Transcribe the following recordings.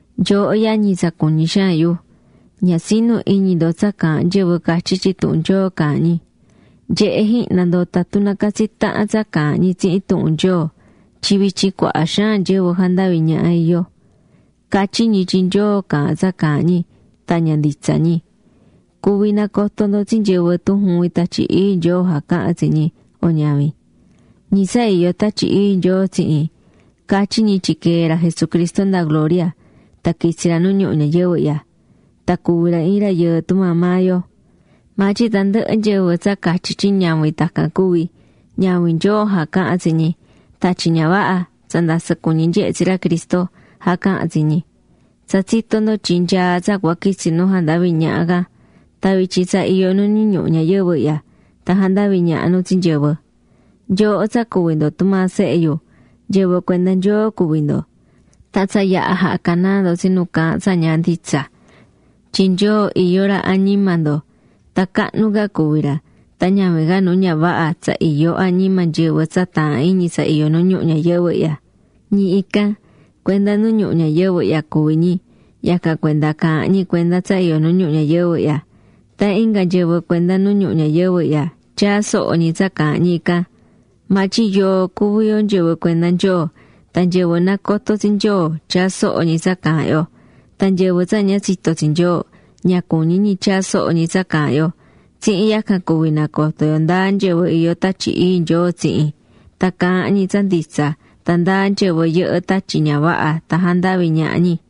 Nyooho yañi tsa cuñí xaan yu, ña tsi̱nu iñi ndo tsa caahán nyɨvɨ catyí tyin tuhun Nyoo caahán ñi. Nye̱he jihna ndo tatun nacatsí tahan tsa caahán ñi tsihin tuhun Nyoo. Tyin vityin cuaha xaan nyɨvɨ jandaví ñaha iyó. Catyí ñi tyin Nyoo caahán tsa caahán ñi tan ña nditsa ñi. Cuví nacoto ndo tsi nyɨvɨ tun juvin Tatyi Ii Nyoo jacahán tsi ñi o ñavin. Ñi tsa iyó Tatyi Ii Nyoo tsihin, catyí ñi tyin quee̱ ra Jesucristo nda gloria tan quitsi̱ ra nu ñuhu ñayɨvɨ ihya, tan cuvi̱ ra iin rayɨɨ tumaa maa yo. Maa tyin tandɨhɨ nyɨvɨ tsa catyí tyin ñavin tacan cuvi̱, ñavin Nyoo jacahán tsi ñi. Tatyi ña vaha, tsa ndasɨ cuñi nyehé tsi ra Cristo, jacahán tsi ñi. Tsa tsitó ndo tyin nyaá tsa cua quitsi nu jandaví ñaha can. Tan vityin tsa iyó nu nu ñuhu ñayɨvɨ ihya tan jandaví ñaha nu tsi nyɨvɨ. Nyooho tsa cuví ndo tumaa sehe yu, nyɨvɨ cuenda Nyoo cuví ndo. Tan tsa yaha̱ jaha̱ canaa ndo tsi nu caahán tsa ña nditsa. Tyin Nyoo iyó ra añima ndo tan cahnu ca cuví ra tan ñavin ca nu ña vaha, tsa iyó añima nyɨvɨ tsa taahán iñi tsa iyó nu ñuhu ñayɨvɨ ihya. Ñi ican, cuenda nu ñuhu ñayɨvɨ ihya cuví ñi. Yacan cuenda caahán ñi cuenda tsa iyó nu ñuhu ñayɨvɨ ihya. Tan inga nyɨvɨ cuenda nu ñuhu ñayɨvɨ ihya tyaá soho ñi tsa caahán ñi ican. Maa tyin yoo cuví yo nyɨvɨ cuenda Nyoo. Tan nyɨvɨ nacotó tsi Nyoo tyaá soho ñi tsa caahán yo. Tan nyɨvɨ tsa ña tsitó tsi Nyoo, ña cuñí ñi tyaa soho ñi tsa caahán yo. Tsihin yacan cuví nacoto yo ndáa nyɨvɨ iyó Tatyi Ii Nyoo tsihin, tan caahán ñi tsa nditsa tan ndáa nyɨvɨ yɨhɨ́ tatyi ña vaha tan jandaví ñaha ñi.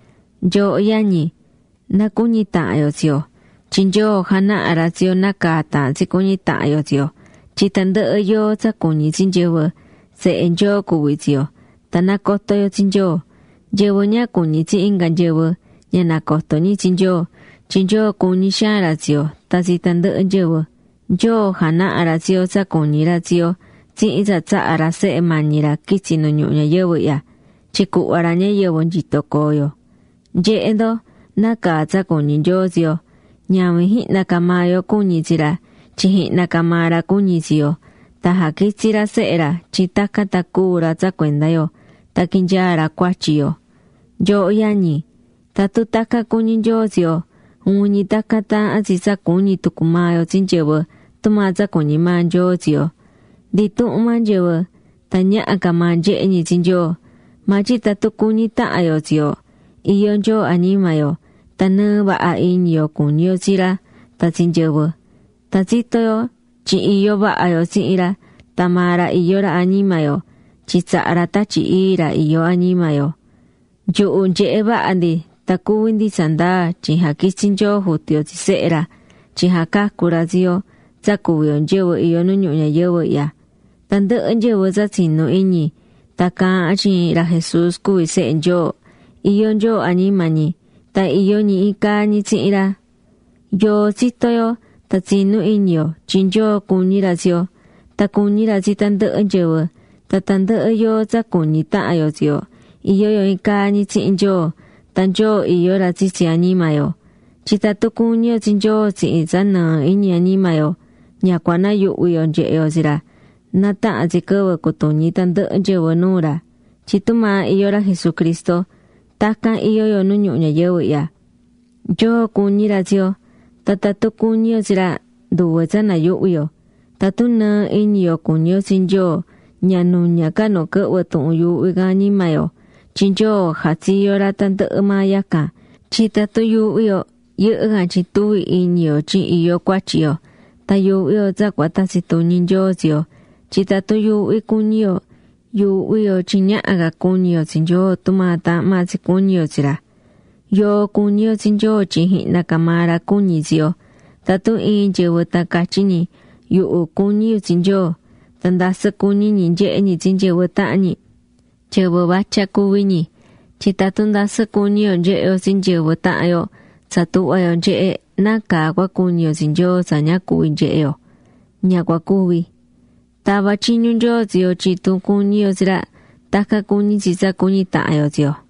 Nyooho yañi, na cuñi tahan yo tsi yo, tyin Nyoo janahá ra tsi yo nácaa taahán tsi cuñi tahan yo tsi yo. Tyin tandɨhɨ yoo tsa cuñí tsi nyɨvɨ, sehe Nyoo cuví tsi yo, tan nacotó yo tsi Nyoo. Nyɨvɨ ña cuñí tsi inga nyɨvɨ, ña nacotó ñi tsi Nyoo, tyin Nyoo cuñí xaan ra tsi yo tan tsi tandɨhɨ nyɨvɨ. Nyoo janaha̱ ra tsi yo tsa cuñí ra tsi yo tsihin tsa tsaha̱ ra Sehe mañi ra quitsi̱ nu ñuhu ñayɨvɨ ihya, tyin cuhva ra ñayɨvɨ nyito coo yo. Nye̱he ndo, nácaa tsa cuñí Nyoo tsi yo. Ñavin jihna ca maa yo cuñi̱ tsi ra, tyin jihna ca maa ra cuñi̱ tsi yo. Tan jaquitsi̱ ra Sehe ra tyin tacan tan cúu ra tsa cuenda yo tan quinyaa ra cuatyi yo. Nyooho yañi, tatun tacan cuñí Nyoo tsi yo, juvin ñi tacan taahán tsi tsa cuñí tucu maa yo tsi nyɨvɨ tumaa tsa cuñí maa Nyoo tsi yo. Ndi intuhun maa nyɨvɨ, tan ñaha ca maa nyehe ñi tsi Nyoo, maa tyin tatun cuñí tahan yo tsi yo, iyó Nyoo añima yo. Tan nɨɨ vaha iñi yo cuñí yo tsi ra tan tsi nyɨvɨ. Tan tsitó yo tyin iyó vaha yo tsihin ra tan maa ra iyó ra añima yo, tyin tsaha̱ ra Tatyi Ii ra iyó añima yo. Nyuhu nyehe̱ vaha ndi tan cuví ndi tsandaa tyin jaquitsi̱ Nyoo Jutu yo tsi Sehe ra tyin jacacu ra tsi yo tsa cuví yo nyɨvɨ iyó nu ñuhu ñayɨvɨ ihya. Tandɨhɨ nyɨvɨ tsa tsinú iñi tan caahán tyin ra Jesús cuví Sehe Nyoo, iyó Nyoo añima ñi. Tan iyó ñi iin caa ñi tsihin ra. Yoo tsitó yo tan tsinú iñi yo tyin Nyoo cuñí ra tsi yo, tan cuñí ra tsi tandɨhɨ nyɨvɨ. Tan tandɨhɨ yoo tsa cuñí tahan yo tsi yo, iyó yo iin caa ñi tsihin Nyoo; tan Nyoo iyó ra tsitsi añima yo. Tyin tatun cuñí yo tsi Nyoo tsihin tsa nɨɨ iñi añima yo, ña cua nayuhvi yo nyehe yo tsi ra na tahan tsi quɨvɨ cutuñi tandɨhɨ nyɨvɨ nuu ra. Tyin tumaa iyó ra Jesucristo, tacan iyó yo nu ñuhu ñayɨvɨ ihya. Nyoo cuñí ra tsi yo, tan tatun cuñí yo tsi ra, nduve tsa nayuhvi yo. Tatun nɨɨ iñi yo cuñí yo tsi Nyoo ña nuña ca nu quɨhvɨ tuhun yuuhví can añima yo, tyin Nyoo jatsiyo̱ ra tandɨhɨ maa yacan. Tyin tatun yuuhví yo, yɨhɨ́ can tyin tuví iñi yo tyin iyó cuatyi yo. Tan yuuhví yo tsa cua tatsi tuñi Nyoo tsi yo. Tyin tatun yuuhví cuñí yo, yuuhví yo tyin ñaha ca cuñi yo tsi Nyoo tumaa taahán maa tsi cuñi yo tsi ra. Yoo cuñí yo tsi Nyoo tyin jihna ca maa ra cuñi̱ tsi yo. Tatun iin nyɨvɨ tan catyí ñi: “Yuhu cuñí yu tsi Nyoo”, tan ndasɨ cuñí ñi nyehé ñi tsi nyɨvɨ tahan ñi, nyɨvɨ vatya cuví ñi. Tyin tatun ndasɨ cuñí yo nyehé yo tsi nyɨvɨ tahan yo tsa tuhvá yo nyehé, ¿nácaa cua cuñi yo tsi Nyoo tsa ña cuví nyehe yo? Ña cua cuvi. Tava̱ tyiñu Nyoo tsi yo tyin tun cuñí yo tsi ra, tacan cuñí tsi tsa cuñí tahan yo tsi yo.